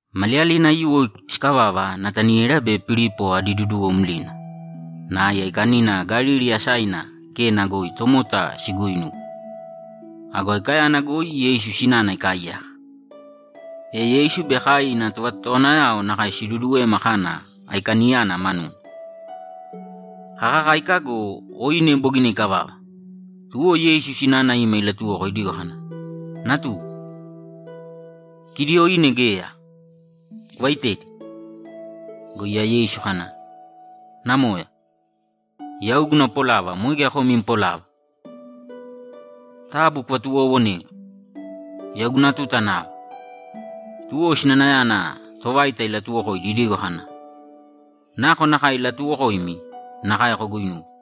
Maliyalina aiyuwo sikavava Nataniela be Pilipo adi duduwo mlina, nai aikanina Galili asaina Kena goi tomota siguuinuwe. Ago aikayana goi Yeisu sinana ikaaiyaka. E Yeisu be kai ina tovatotowanayao nakae siduduwema kana aikaniyana manuna. Kakakáika go, oine bogina ikavava, tuwo Yeisu sinana ima ilatuwoko idigo kana, ‘Natugu, kidi oine geya. Kuvaitēdi.’ Go iya Yeisu kana, ‘Namoya, yau guna polava moe geya kom im polava. Taabu kuvatuwoowonēgu! Yau guna tuta nava.’ Tuwo sinanayana tovaita ilatuwokoidi idigo kana, ‘Nakonakae ilatuwokoimi, nakae koguinūwe.’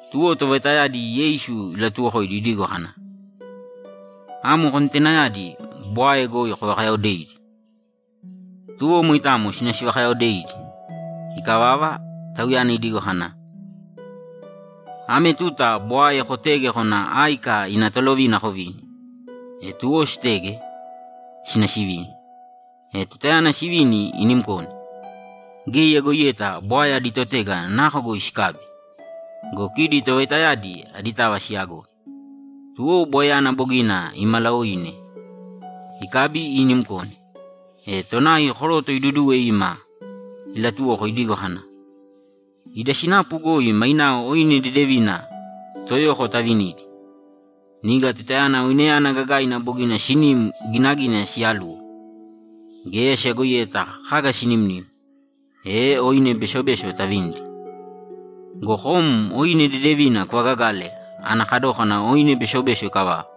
Tuwo tovaitayadi Yeisu ilatuwokoidi idigo kana, ‘Amo kontenayadi bwae goi kovakayaodēidi.’ Tuwo moitamo sina sivakayaodeidi. Ikavava, Tauyana idigo kana, ‘Ame tuta bwae kotēge kōna áika ina tolovina kovīni.’ E tuwo sitege, sina sivini. E tutayana sivini inimkone, geya iyagoiyeta bwae adi totega nako goi sikabi go, kidi tovaitayadi aditava siyagoi. Tuwo bwaeyana bogina imalaoine ikabi inimkone, e tonai koroto iduduwe ima ilatuwoko idigo kana, ‘Ida sinapu goi mainao oine dedevina toyoko tavinidi. Niga tutayana oineyana gagaina bogina sinim ginagina siyaluwo, geya siyagoiyeta kaga sinimnim, e oine besobeso tavinidi. Go kom oine dedevina kuvagagale ana kadókana oine besobeso ikavava.’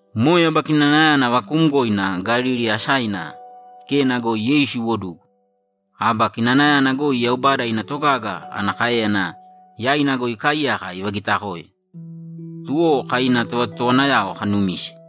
Moe aba kinanayana vakuumgoina Galili asaina Kena goi Yeisu iwodugu. Aba kinanayana goi Yaubada ina togaga ana káeyana yaina goi ikaaiyaka ivagitakoe, tuwo kai ina tovatotowanayao kanumise.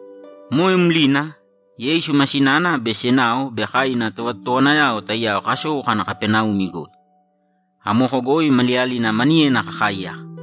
Moe mlina, Yeisu ma sinana be senao be kai ina tovatotowanayao taiyao kasou kana Kapaneumi goi. Amoko goi maliyalina maniyena kakaaiyaka.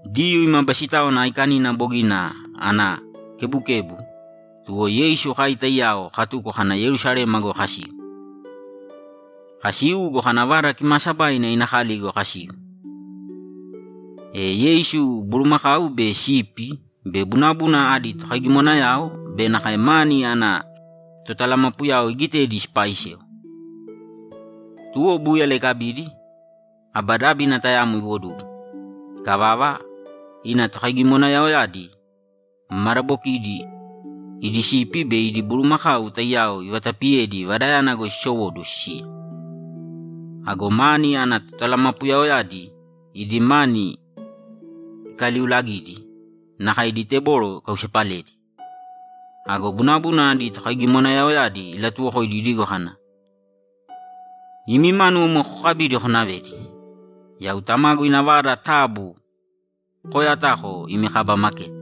Diyuu ima Basitáwana Aikanina bogina ana kebukebu, tuwo Yeisu kai taiyao katuko kana Yerusalema goi kasiu. Kasiu go, kana Vada Kimaasabaina ina kali goi kasiu, e Yeisu bulumakau be sipi be bunabuna adi tokaigimonayao be nakae mani ana totalamapuyao igitedi sipaaisewa. Tuwo búyala ikabidi, aba dábina tayamo iwodugu. Ikavava, ina tokaigimonayaoyadi madabokidi idi sipi be idi bulumakau taiyao ivatapiyedi Vadayana goi sisowóduwo sisiya. Ago mani ana totalamapuyaoyadi idi mani ikaliulagidi nakae idi teboro ikausepaledi. Ago bunabuna adi tokaigimonayaoyadi ilatuwokoidi idigo kana, ‘Imi mánuwo moe kokabīdi konavēdi! Yau Tamagu ina vada taabu kooyatāko imi kaba maketi!’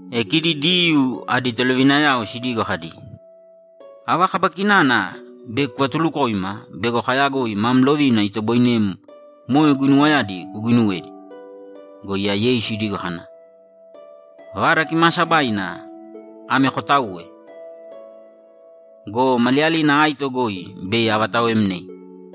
E kidi Diyuu adi tolovinayao sidigo kadi, ‘Ava kaba kinana bei kuvatulukoima bego kayagoi mam lovina itoboinem moe guinuwayadi kuguinuwedi?’ Go iya Yeisu idigo kana, ‘Vada Kimaasabaina ame kotaūwe go, maliyalina aito goi bei avataoemnei.’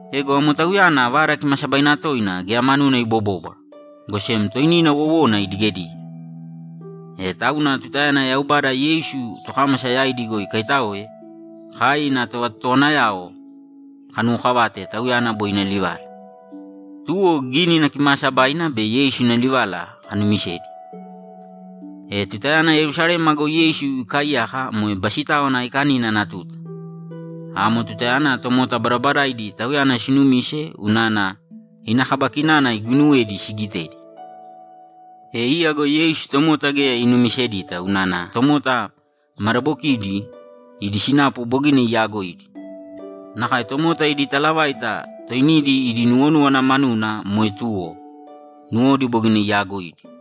Ego amo Tauyana Vada Kimaasabaina toina geya manuna ibobóbwara, go sem toinina wowona idigedige. E tauna tutayana Yaubada Yeisu tokámasa yaidi goi ikaitáoe, kai ina tovatotowanayao kanuwokavate Tauyana boi ina livala. Tuwo Gínina Kimaasabaina be Yeisu ina livala kanumisedi. E tutayana Yerusalema goi Yeisu ikaaiyaka moe Basitáwana Aikanina ana tuta. Amo tutayana tomota badabadaidi Tauyana sinumise unana ina kaba kinana iguuinuwedi sigitedi. E iya go Yeisu tomota geya inumisedita unana tomota madabokidi idi sinapu bogina iyaagoidi. Nakae tomota idi talavaita toinidi idi nuwonúwana manuna moe tuwo; nuwodi bogina iyaagoidi.